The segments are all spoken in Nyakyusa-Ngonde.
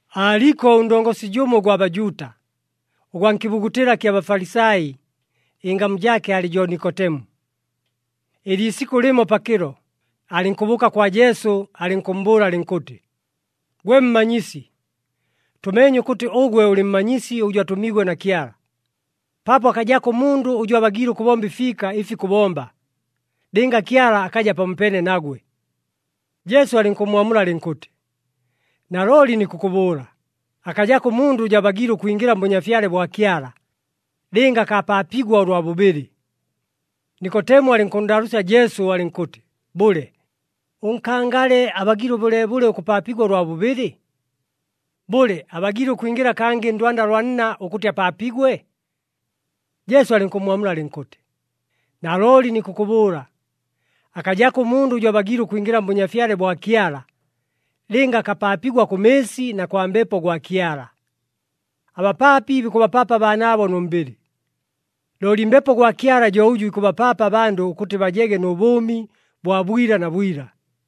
Aaliko ʉndongosi jʉmo ʉgwa Bajuuta, ʉgwa nkɨbugutɨla kya Bafalisai, ɨngamu jaake aalɨ jo Nikotemu. Ɨliisikʉ lɨmo pakɨlo, alɨnkʉbʉʉka kwa Jesu alɨnkʉmmbʉʉla alɨnkʉtɨ, “Gwe Mmanyisi, tʉmeenye ʉkʉtɨ ʉgwe ʉlɨ mmanyisi ʉjʉ atʉmiigwe na Kyala, paapo akajako ʉmundʉ ʉjʉ abagiile ʉkʉbomba ɨfiika ɨfi kʉbomba, lɨnga Kyala akaja pamopeene nagwe.” Jesu alɨnkʉmmwamula alɨnkʉtɨ, “Nalooli nikʉkʉbʉʉla, akajako ʉmundʉ ʉjʉ abagiile ʉkwingɨla mBʉnyafyale bwa Kyala, lɨnga akapaapigwa ʉlwa bʉbɨlɨ.” Nikotemu alɨnkʉnndaalʉʉsya Jesu alɨnkʉtɨ, “Bʉle, ʉnkangale abagiile bʉleebʉle ʉkʉpaapigwa ʉlwa bʉbɨlɨ? Bʉle, abagiile ʉkwingɨla kangɨ ndwanda lwa nna ʉkʉtɨ apaapigwe?” Jesu alɨnkʉmmwamula alɨnkʉtɨ, “Nalooli nikʉkʉbʉʉla, akajako ʉmundʉ ʉjʉ abagiile ʉkwingɨla mBʉnyafyale bwa Kyala, lɨnga akapaapigwa kʉ mɨɨsi na kwa Mbepo gwa Kyala. Abapaapi bikʉbapaapa abaanaabo nʉ mbɨlɨ, looli Mbepo gwa Kyala jo ʉjʉ ikʉbapaapa abandʉ ʉkʉtɨ bajege nʉ bʉʉmi bwa bwila na bwila.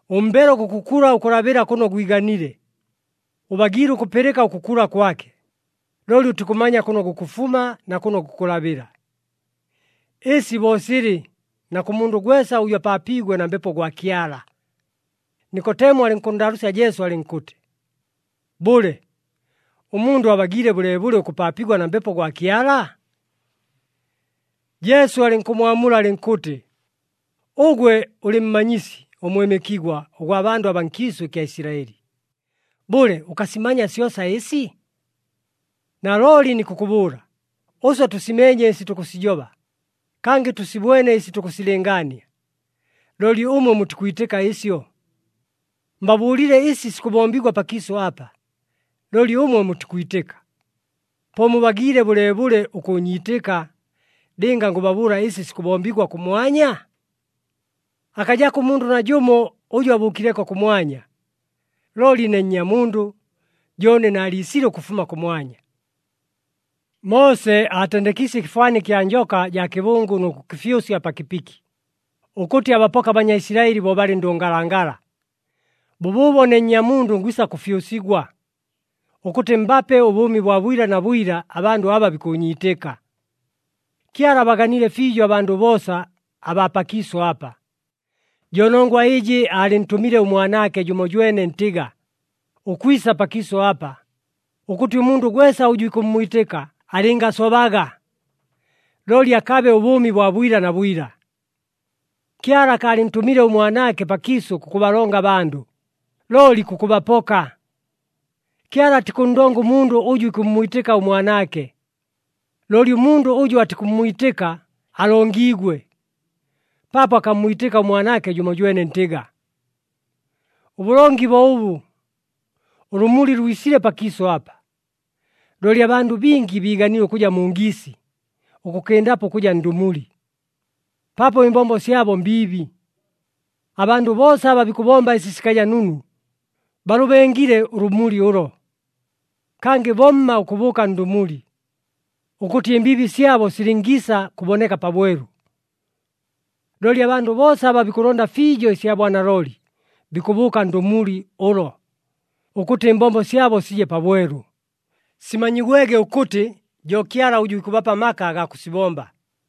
Ʉmbelo gukʉkula ʉkʉlabɨla kʉno gwiganile. Ʉbagiile ʉkʉpɨlɨka ʉkʉkula kwake, looli ʉtikʉmanya kʉno gukʉfuma na kʉno gukʉlabɨla. Ɨsi bo silɨ na kʉ mundʉ gwesa ʉjʉ apaapiigwe na Mbepo gwa Kyala.” Nikotemu alɨnkʉnndaalʉʉsya Jesu alɨnkʉtɨ, “Bʉle, ʉmundʉ abagiile bʉleebʉle ʉkʉpaapigwa na Mbepo gwa Kyala?” Jesu alɨnkʉmmwamula alɨnkʉtɨ, “Ʉgwe ʉlɨ mmanyisi ʉmwɨmɨkigwa ʉgwa bandʉ abaa nkiisʉ ɨkya Isilaɨli. Bʉle, ʉkasimanya syosa ɨsi? Nalooli nikʉkʉbʉʉla, ʉswe tʉsimeenye ɨsi tukʉsijoba, kangɨ tʉsibwene ɨsi tukʉsilɨngaania. Looli ʉmwe mutikwitɨka ɨsyo. Mbabʉʉlile ɨsi sikʉbombigwa pakiisʉ apa, looli ʉmwe mutikwitɨka. Po mubagiile bʉleebʉle ʉkʉʉnyiitɨka, lɨnga ngʉbabʉʉla ɨsi sikʉbombigwa kʉmwanya? Akajako ʉmundʉ najʉmo ʉjʉ abʉʉkileko kʉmwanya. Looli ne Nnyamundʉ jo ʉne naaliisile ʉkʉfuma kʉmwanya. “Moose aatendekiisye ɨkɨfwani kya njoka jaa kɨbʉngʉ nʉ kʉkɨfyʉsya pa kɨpiki, ʉkʉtɨ abapoke aBanyaisilaɨli bo balɨ ndʉngalangala. Bʉbʉʉbo ne Nnyamundʉ ngwisa kʉfyʉsigwa, ʉkʉtɨ mbape ʉbʉʉmi bwa bwila na bwila abandʉ aba bikʉʉnyiitɨka.” Kyala abaganile fiijo abandʉ boosa abaa pakiisʉ apa. Jo nongwa ɨjɨ aalɨntʉmile ʉMwanaake jʉmojwene ntɨga, ʉkwisa pakiisʉ apa, ʉkʉtɨ ʉmundʉ gwesa ʉjʉ ikʉmmwitɨka alɨngasobaga, looli akabe ʉbʉʉmi bwa bwila na bwila. Kyala akaalɨntʉmile ʉMwanaake pakiisʉ kʉkʉbalonga abandʉ, looli kʉkʉbapoka. Kyala atikʉnndonga ʉmundʉ ʉjʉ ikʉmmwitɨka ʉMwanaake, looli ʉmundʉ ʉjʉ atikʉmmwitɨka alongiigwe, paapo akammwitɨka ʉMwanaake jʉmojwene ntɨga. Ʉbʉlongi bo ʉbʉ, ʉlʉmuli lwisile pakiisʉ apa, looli abandʉ bingi biiganile ʉkʉja mu ngiisi ʉkʉkɨndapo ʉkʉja ndʉmuli, paapo ɨmbombo syabo mbiibi. Abandʉ boosa aba bikʉbomba ɨsi sikaja nunu, balʉbengile ʉlʉmuli ʉlo. Kangɨ bomma ʉkʉbʉʉka ndʉmuli, ʉkʉtɨ ɨmbiibi syabo silɨngiisa kʉboneka pabwelu. Looli abandʉ boosa aba bikʉlonda fiijo ɨsya bwanalooli bikʉbʉʉka ndʉmuli ʉlo, ʉkʉtɨ ɨmbombo syabo sije pabwelu, simanyigwege ʉkʉtɨ jo Kyala ʉjʉ ikʉbapa amaka agaa kʉsibomba.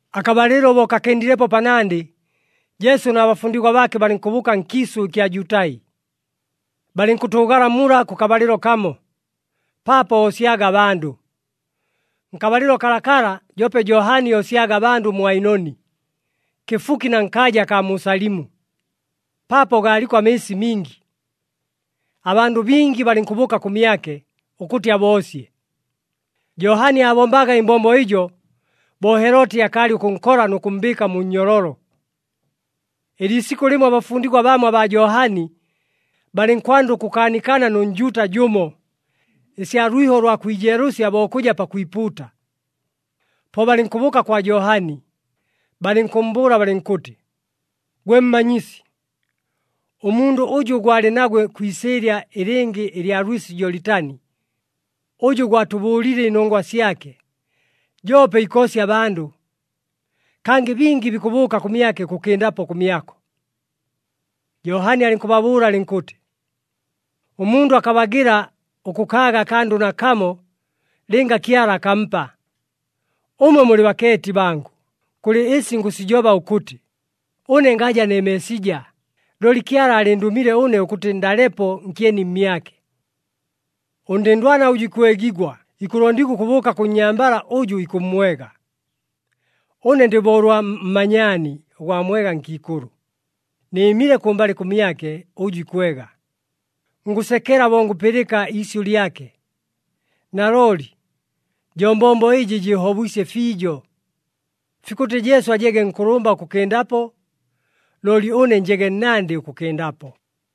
Akabalɨlo bo kakɨndilepo panandɨ, Jesu na bafundigwa baake balɨnkʉbʉʉka nkiisʉ ɨkya Jutai. Balɨnkʉtʉʉgala mula kʉkabalɨlo kamo, paapo oosyaga abandʉ. Nkabalɨlo kalakala, joope Johani oosyaga abandʉ mu Ainoni, kɨfuki na nkaaja akaa mu Salimu, paapo gaaliko amɨɨsi mingi. Abandʉ bingi balɨnkʉbʉʉka kʉmyake ʉkʉtɨ aboosye. Johani aabombaga ɨmbombo ɨjo, bo Heloti akaalɨ ʉkʉnkola nʉ kʉmmbɨɨka mu nnyololo. Ɨliisikʉ lɨmo abafundigwa bamo abaa Johani, balɨnkwanda ʉkʉkaanikana nʉ Njuuta jʉmo, ɨsya lwiho ʉlwa kwijeelʉsya bo kʉja pakwipuuta. Po balɨnkʉbʉʉka kwa Johani, balɨnkʉmmbʉʉla balɨnkʉtɨ, “Gwe Mmanyisi, ʉmundʉ ʉjʉ gwalɨ nagwe kwi isɨɨlya ɨlɨngɨ ɨlya lwɨsi Jolitani, ʉjʉ gwatʉbʉʉlile ɨnongwa syake, joope ikoosya abandʉ. Kangɨ bingi bikʉbʉʉka kʉmyake ʉkʉkɨndapo kʉmyako.” Johani alɨnkʉbaamula alɨnkʉtɨ, “Ʉmundʉ akabagɨla ʉkʉkaaga akandʉ nakamo, lɨnga Kyala akampa. Ʉmwe mulɨ bakeeti bangʉ, kʉlɨ ɨsi ngʉsijoba ʉkʉtɨ, ‘Ʉne ngaja ne Meesija, looli Kyala aalɨndʉmile ʉne ʉkʉtɨ ndalepo nkyeni mmyake.’ Ʉndɨndwana ʉjʉ ikwegigwa ikʉlondigwa ʉkʉbʉʉka kʉ nnyambala ʉjʉ ikʉmmwega. Ʉne ndɨ bo ʉlwa mmanyaani ʉgwa mwega nkiikʉlʉ, nɨɨmile kʉmbalɨ kʉmyake ʉjʉ ikwega, ngʉsekela bo ngʉpɨlɨka iisyʉ lyake. Nalooli jo mbombo ɨjɨ jɨɨhobwisye fiijo. Fikʉtɨ Jesu ajege nkʉlʉmba ʉkʉkɨndapo, looli ʉne njege nnandɨ ʉkʉkɨndapo.”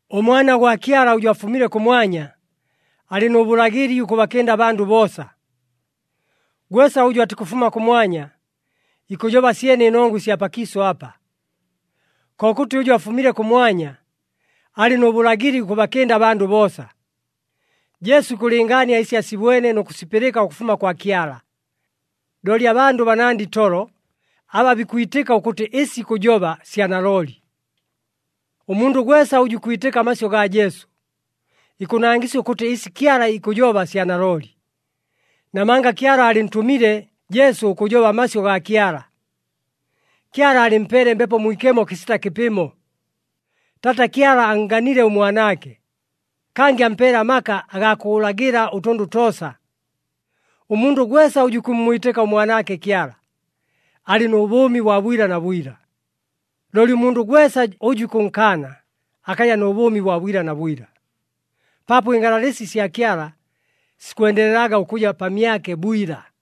ɄMwana gwa Kyala ʉjʉ afumile kʉmwanya, alɨ nʉ bʉlagɨli ʉkʉbakɨnda abandʉ boosa. Gwesa ʉjʉ atikʉfuma kʉmwanya, ikʉjoba syene ɨnongwa ɨsya pakiisʉ apa. Kokʉtɨ ʉjʉ afumile kʉmwanya, alɨ nʉ bʉlagɨli ʉkʉbakɨnda abandʉ boosa. Jesu ikʉlɨngaania ɨsi asibwene nʉ kʉsipɨlɨka ʉkʉfuma kwa Kyala, looli abandʉ banandɨ itolo aba bikwitɨka ʉkʉtɨ ɨsi ikʉjoba sya nalooli. Ʉmundʉ gwesa ʉjʉ ikwitɨka amasyʉ gaa Jesu, ikʉnangɨsya ʉkʉtɨ ɨsi Kyala ikʉjoba sya nalooli, namanga Kyala aalɨntʉmile Jesu ʉkʉjoba amasyʉ gaa Kyala. Kyala aalɨmpeele Mbepo Mwikemo kɨsita kɨpɨmo. Taata Kyala annganile ʉMwanaake, kangɨ ampeele amaka agaa kʉlagɨla ʉtʉndʉ toosa. Ʉmundʉ gwesa ʉjʉ ikʉmmwitɨka ʉMwanaake Kyala, alɨ nʉ bʉʉmi bwa bwila na bwila. Looli ʉmundʉ gwesa ʉjʉ ikʉnkaana, akaja nʉ bʉʉmi bwa bwila na bwila, paapo ɨngalalɨsi sya Kyala sikwendelelaga ʉkʉja pamyake bwila.